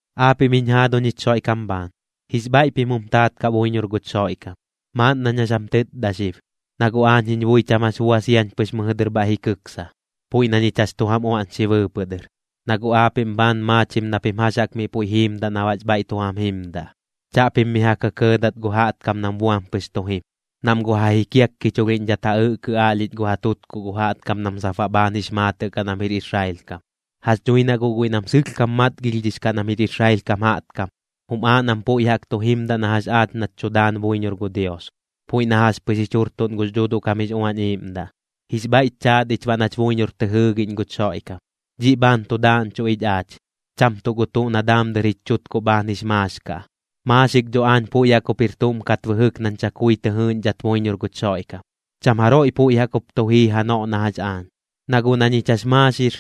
Aapiꞌm jiñ jaaduñ jich Xoiꞌkam bhaan, jix bhaiꞌ pim jum taat kaꞌ buiñor guch Xoiꞌkam. Maaꞌn nañ jax jam tɨtda xib, na guꞌ aañ jiñ bui cham jax bua siañ pɨx mɨjɨ dɨr bhaiꞌ ji kɨksa, puiꞌ na ñich jax tu jam uaꞌñxi bɨɨpɨꞌ dɨr, na guꞌ aapiꞌm bhaan maachim na pim jax jaꞌk miꞌ puiꞌ jiimdaꞌ na baꞌx bhaiꞌ tu jam jimdaꞌ. Chaꞌpim mi ja kɇkɇɇdat gu jaꞌtkam nam buam pɨx tu jim, nam guꞌ ja jikiakkichulhiꞌñdhat ja ɨꞌkɨ aꞌlhich gu ja tutkuꞌ gu jaꞌtkam nam sap baꞌ bhaan jix maatɨꞌ kaꞌ nam jir Israel kam. Jax dhui na guꞌ guiꞌ nam sɨlhkam matgilhdhix kaꞌ nam jir Israel kam jaꞌtkam, jum aaꞌ nam puiꞌ jaꞌk tu jimdaꞌ na jax aach nach tu daan buiñor gu Dios, puiꞌ na jax pɨx jich jurtuꞌn gux Dhuuduꞌ kam jix Uañ Iiꞌmdaꞌ, jix bhaiꞌch chaat ich baꞌ nach buiñor tɨ jɨɨgiꞌñ guch Xoiꞌkam. Dhiꞌ bhaan tu daaꞌñchuꞌ ich aach, cham tuꞌ gu tuꞌ na daam dɨr jich chutkuꞌ bhaan jix maax kaꞌ. Maaxik dho aañ puiꞌ jaꞌk jup jir tuꞌm kat bɨjɨk nañ chakui tɨ jɨɨꞌñdhat buiñor guch Xoiꞌkam. Cham jaroiꞌ puiꞌ jaꞌk jup tu jii janoꞌ na jax aañ. Na guꞌ na ñich jax maaxir,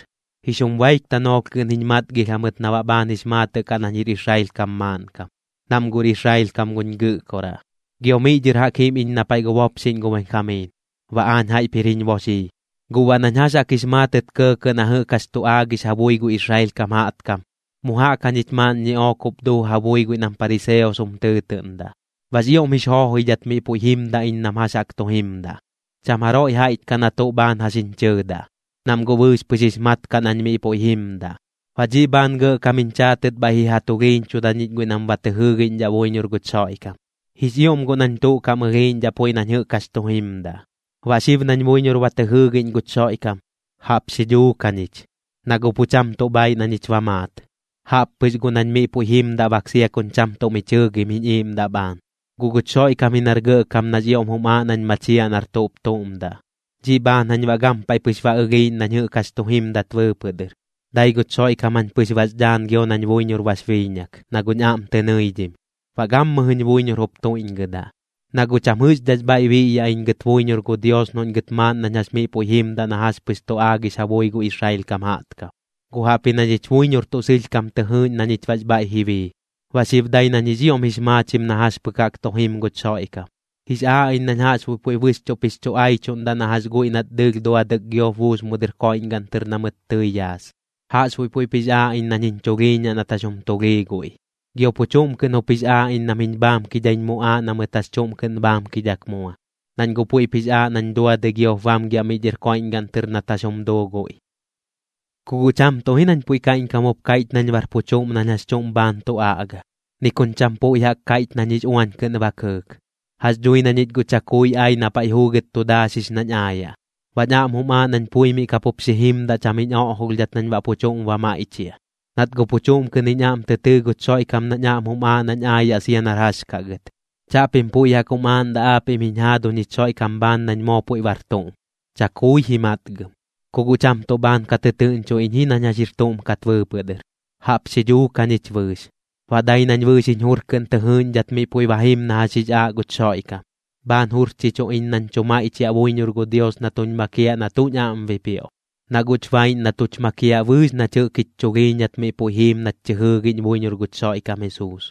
jix jum baik tanoolh kɨꞌn jiñ matgilh jamɨt na baꞌ bhaan jix maatɨꞌ kaꞌ nañ jir Israel kam maaꞌnkam, nam guꞌr Israel kam guñ gɨꞌkoraꞌ, gio miꞌ dhɨr jaꞌk jim iñ na paiꞌ gu bopxiꞌñ gu Benjamiin, baꞌ aañ jaiꞌp jir jiñ boxii. Guꞌ baꞌ nañ jax jaꞌk jix maatɨt kɇɇkɇꞌ na jɨꞌk jax tu aagix ja bui gu Israel kam jaꞌtkam, mu jaꞌk jañich maaꞌn ñiꞌook jup duu ja bui guiꞌ nam pariseos jum tɨɨtɨꞌndaꞌ. Baꞌx ioꞌm jix joojoidhat miꞌ puiꞌ jimdaꞌ iñ nam jax jaꞌk tu jimdaꞌ, cham jaroiꞌ jaiꞌch kaꞌ na tuꞌ bhaan jax jiñ chɨɨdaꞌ, nam guꞌ bɨɨx pɨx jix mat kaꞌ nañ miꞌ puiꞌ jimdaꞌ. Baꞌ dhiꞌ bhaan gɇꞌkam jiñ chaatɨt bhaiꞌ ji ja tulhiiñchuda ñich guiꞌ nam ba tɨ jɨɨgiꞌñdhaꞌ buiñor guch Xoiꞌkam. Jix ioꞌm guꞌ nañ tuꞌ kaꞌm ɨlhiiꞌñdhaꞌ puiꞌ nañ jɨꞌk jax tu jimdaꞌ. Baꞌ xib nañ buiñor ba tɨ jɨɨgiꞌñ guch Xoiꞌkam, jaꞌp xi dhuuk jañich, na guꞌ pu cham tuꞌ bhaiꞌ na ñich ba maat. Jaꞌp pɨx guꞌ nañ miꞌ puiꞌ jimdaꞌ bak sia kuñ cham tuꞌ mi chɨɨgim jiñ iiꞌmdaꞌ bhaan, guꞌ guch Xoiꞌkam ji nar gɇꞌkam nax ioꞌm jum aaꞌ nañ machiaꞌ nar tuꞌp tuꞌm daꞌ. Dhiꞌ bhaan jañ baꞌ gampaiꞌ pɨx ba ɨlhiiꞌñ nañ jɨꞌk jax tu jimdat bɨɨpɨꞌ dɨr, dai guch Xoiꞌkam jañ pɨx bax dhaan gio nañ buiñor bax biiñak, na guꞌñ aꞌm tɨ nɨidhim, baꞌ gammɨjɨñ buiñor jup tuiꞌñgɨdaꞌ. Na guꞌ cham jɨꞌxdhaꞌx bhaiꞌ biꞌyaꞌ iñ gɨt buiñor gu Dios noꞌñ gɨt maaꞌn nañ jax miꞌ puiꞌ jimdaꞌ na jax pɨx tu aagix ja bui gu Israel kam jaꞌtkam, guꞌ jaꞌpji na ñich buiñor tuꞌ sɨlhkam tɨ jɨɨꞌñ na ñich baꞌx bhaiꞌ ji bii. Baꞌ xib dai nañ jix ioꞌm jix maachim na jax pɨk jaꞌk tu jim guch Xoiꞌkam. Jix aaꞌ iñ nañ jaꞌxbuiꞌ puiꞌ bɨxchuꞌp jix chu aichuꞌndaꞌ na jax guiꞌ nat dɨɨlh duadɨk giop buus mu dɨr koiꞌñgaꞌn tɨr na mɨt tɨi yaas. Jaꞌxbuiꞌ puiꞌp jix aaꞌ iñ nañ jiñ chulhiiñaꞌ nat jax jum tulhii guiꞌ, gio pu chuꞌm kɨꞌn jup jix aaꞌ iñ nam jiñ bhaamkidhaiñ muꞌaaꞌ na mɨt jax chuꞌm kɨꞌn bhaamkidhak mua, nañ guꞌ puiꞌp jix aaꞌ nañ duadɨi giop bamgiaꞌ miꞌ dhɨr koiꞌñgaꞌn tɨr nat jax jum duu guiꞌ. Ku guꞌ cham tuꞌ ji nañ puiꞌ kaiꞌñkam jup kaiꞌch nañ bar pu chuꞌm nañ jax chuꞌm bhaan tu aꞌga, ni kuñ cham puiꞌ jaꞌk kaiꞌch nañ jix uañ kɨꞌn ba kɨɨk. Jax dhui na ñich guꞌ chakui ai na paiꞌ juugɨt tu daaxix nañ aayaꞌ, baꞌñ aꞌm jum aaꞌ nañ pui miꞌ ka pup xi jimdaꞌ cham jiñ oꞌjolhdhat nañ baꞌ pu chuꞌm ba maiꞌchiaꞌ, nat guꞌ pu chuꞌm kɨꞌn jiñ aꞌm tɨ tɨɨ guch Xoiꞌkam nañ aꞌm jum aaꞌ nañ aayaꞌ sia nar jax kaꞌ gɨt. Chaꞌpim puiꞌ jaꞌk jum aaꞌndaꞌ aapiꞌm jiñ jaaduñ jich Xoiꞌkam bhaan nañ moo puiꞌ bar tuꞌm. Chakui ji matgam. Ku guꞌ cham tuꞌ bhaan ka tɨtɨɨꞌñcho iñ ji nañ jax jir tuꞌm kat bɨɨpɨꞌ dɨr, jaꞌp xi dhuuk jañich bɨɨx. Baꞌ dai nañ bɨɨx jiñ jur kɨꞌn tɨ jɨɨꞌñdhat miꞌ puiꞌ jim na jax jix aaꞌ guch Xoiꞌkam. Bhaan jurchichu iñ nañ tu maiꞌchiaꞌ buiñor gu Dios na tuñ makiaꞌ na tuꞌñ aꞌm bipioꞌ, na guꞌch baiꞌñ na tuch makiaꞌ bɨɨx nach jɨꞌk jich chulhiiñat miꞌ puiꞌ jiim nach tɨ jɨɨgiꞌñ buiñor guch Xoiꞌkam Jesuus.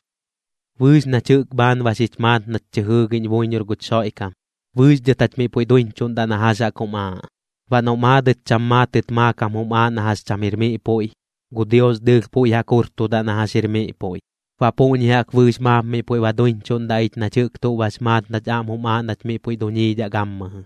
Bɨɨx nach jɨꞌk bhaan ba xich maat nach tɨ jɨɨgiꞌñ buiñor guch Xoiꞌkam, bɨɨx dhɨt jach miꞌ puiꞌ duiñchuꞌndaꞌ na jax jaꞌk jum aaꞌ. Baꞌ noꞌ maadɨt cham maatɨt maakam jum aaꞌ na jax cham jir miꞌ puiꞌ, gu Dios dɨɨlh puiꞌ jaꞌk jurtudaꞌ na jax jir miꞌ puiꞌ. Baꞌ puꞌñi jaꞌk bɨɨx maap miꞌ puiꞌ ba duiñchuꞌndaꞌ ich nach jɨꞌk tuꞌ bax maat nach aꞌm jum aaꞌ nach miꞌ puiꞌ duñiidhaꞌ gammɨjɨ.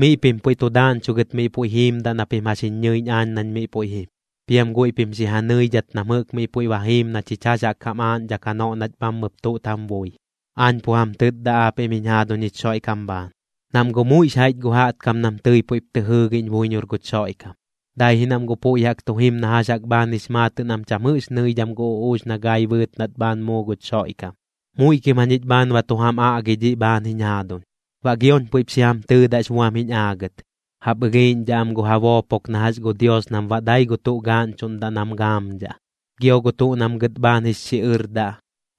Miꞌ pim puiꞌ tu daaꞌñchugɨt miꞌ puiꞌ jiimdaꞌ na pim jax jiñ ñɨiꞌñ aañ nañ miꞌ puiꞌ jim, piam guiꞌ pim xi ja nɨidhat nam jɨꞌk miꞌ puiꞌ ba jiim na chich jax jaꞌk jam aaꞌñdhak janoꞌ nach bhammɨp tuꞌt jam bui. Aañ pu jam tɨtda aapiꞌm jiñ jaaduñ jich Xoiꞌkam bhaan. Nam guꞌ muiꞌx jaiꞌch gu jaꞌtkam nam tɨi puiꞌp tɨ jɨɨgiꞌñ buiñor guch Xoiꞌkam, dai ji nam guꞌ puiꞌ jaꞌk tu jim na jax jaꞌk bhaan jix maatɨꞌ nam cham jɨꞌx nɨidham gu uꞌuux na gai bɨɨt nat bhaan muu guch Xoiꞌkam. Muiꞌ kim jañich bhaan ba tu jam aꞌgi dhiꞌ bhaan jiñ jaaduñ, baꞌ gioñ puiꞌp xi jam tɨtdax buam jiñ aagɨt. Jaꞌp ɨlhiiꞌñdhaꞌ am gu ja boopok na jax gu Dios nam baꞌ dai gu tuꞌ gaaꞌñchuꞌndaꞌ nam gaamdhaꞌ. Gio gu tuꞌ nam gɨt bhaan jix xiꞌɨrdaꞌ,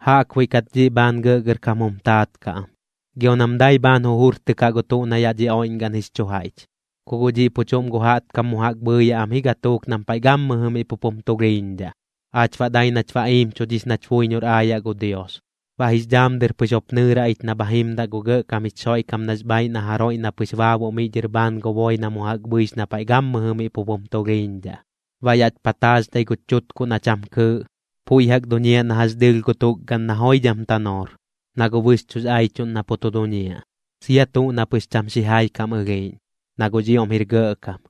jaꞌkbuiꞌ kat dhiꞌ bhaan gɇꞌgɇrkam jum taat kaꞌ am, gio nam dai bhaan jujurtɨkaꞌ gu tuꞌ na yaꞌ dhi oiꞌñgaꞌn jix chu jaiꞌch. Ku guꞌ dhiꞌ pu chuꞌm gu jaꞌtkam mu jaꞌk bhɨɨyaꞌ am ji gatuuk nam paiꞌ gammɨjɨ miꞌ pup jum tulhiiñdhaꞌ. Aach baꞌ dai nach ba iimchudhix nach buiñor aayaꞌ gu Dios. Baꞌ jix dhaam dɨr pɨx jup nɨɨraꞌ ich na bha jimdaꞌ gu gɇꞌkam jich Xoiꞌkam nax bhaaiꞌ na jaroiꞌ na pɨx baabuꞌ miꞌ dhɨr bhaan gu boi na mu jaꞌk bhɨix na paiꞌ gammɨjɨ miꞌ pup jum tulhiiñdhaꞌ. Baꞌ yaꞌch pataaxdhai guch chutkuꞌ na cham kɨɨꞌ, puiꞌ jaꞌk duñiaꞌ na jax dɨɨlh gu tukgaꞌn na joidham tanoor, na guꞌ bɨxchuꞌx aichuꞌn na pu tu duñiaꞌ, sia tuꞌ na pɨx cham xijai kam ɨlhiiꞌñ, na guꞌx ioꞌm jir gɇꞌkam.